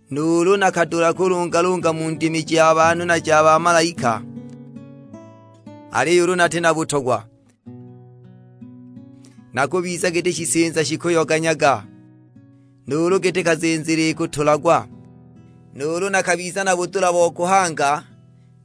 Nuulu nakadula kulungalunga mu ndimi ja banhu na ja bamalaika, aliyo ulu nati na butogwa, nakubiza giti shisinza shikuyoganyaga, nuulu giti kazinzili ikutulagwa. Nuulu nakabiza na budula bo kuhanga,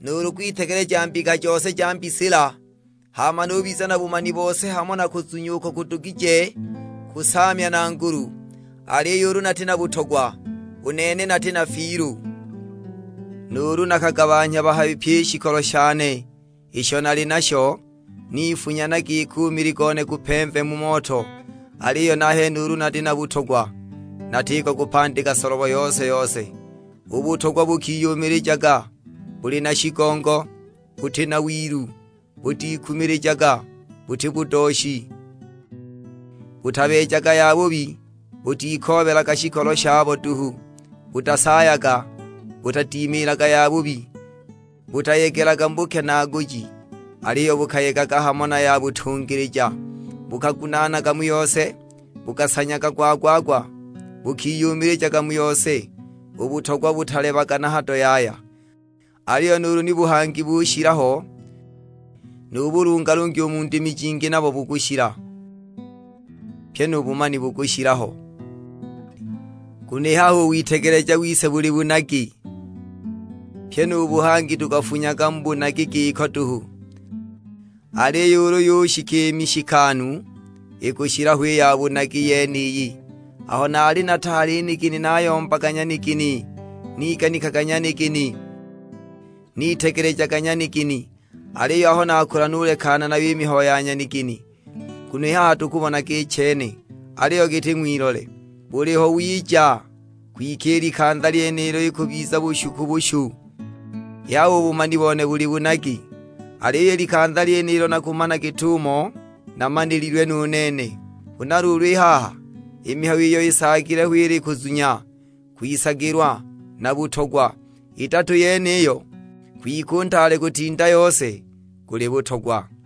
nuulu kwitegeleja mbika jose ja mbisila, hama nubiza na bumani bose hamo na kuzunya uko kudugije kusaamya na ngulu; aliyo ulu nati na butogwa, u nene nati na fiilu! Nuulu nakagabanhya bahabi pyi i shikolo shane isho nali nasho, nifunya na giki u mili gone gupemve mu moto; aliyo nahene ulu nati na butogwa natiko kupandika solobo yose-yose! U butogwa bukiyumilijaga, buli na shigongo, buti na wilu, butikumilijaga, buti budooshi, butabeejaga yabubi, butikoobelaga shikolo shabo duhu, butasaayaga, butadimiilaga yabubi, butayegelaga mu bukenaaguji. Aliyo bukayegaga hamo na yabutungilija, bukagunaanaga mu yose, bukasanyaga gwa-gwa-gwa, bukiyumilijaga mu yose. U butogwa butalebaga na hado yaya; aliyo nuulu ni buhangi bukushila ho, nu bulungalungi mu ndimi jingi nabo bukushila, pyi nu bumani bukushila ho. Nguno i haha u witegeleja wise buli bunagi, pyi nu buhangi tukafunyaga mu bunagi giko duhu. Aliyo ulu yushika i mishikanu, ikushila ho i ya bunagi yeniyi. Aho naali nataali nigini nayombaga nyanigini, niganikaga nyanigini, nitegelejaga nyanigini; aliyo aho nakula nulekana nayo i mihayo ya nyanigini. Nguno i haha tukubonaga i chene, aliyo giti ng'wilole; buliho wiija, kwike i likanza lyenilo ikubiza bushu ku bushu. I haha u bumani bone buli bunagi, aliyo i likanza lyenilo nakumana git'umo namanililwe nu nene. Huna luulu i haha i mihayo iyo isaagile ho ili kuzunya, kwisagilwa, na butogwa; idatu yeniyo, kwike u ntaale kutinda yose guli butogwa.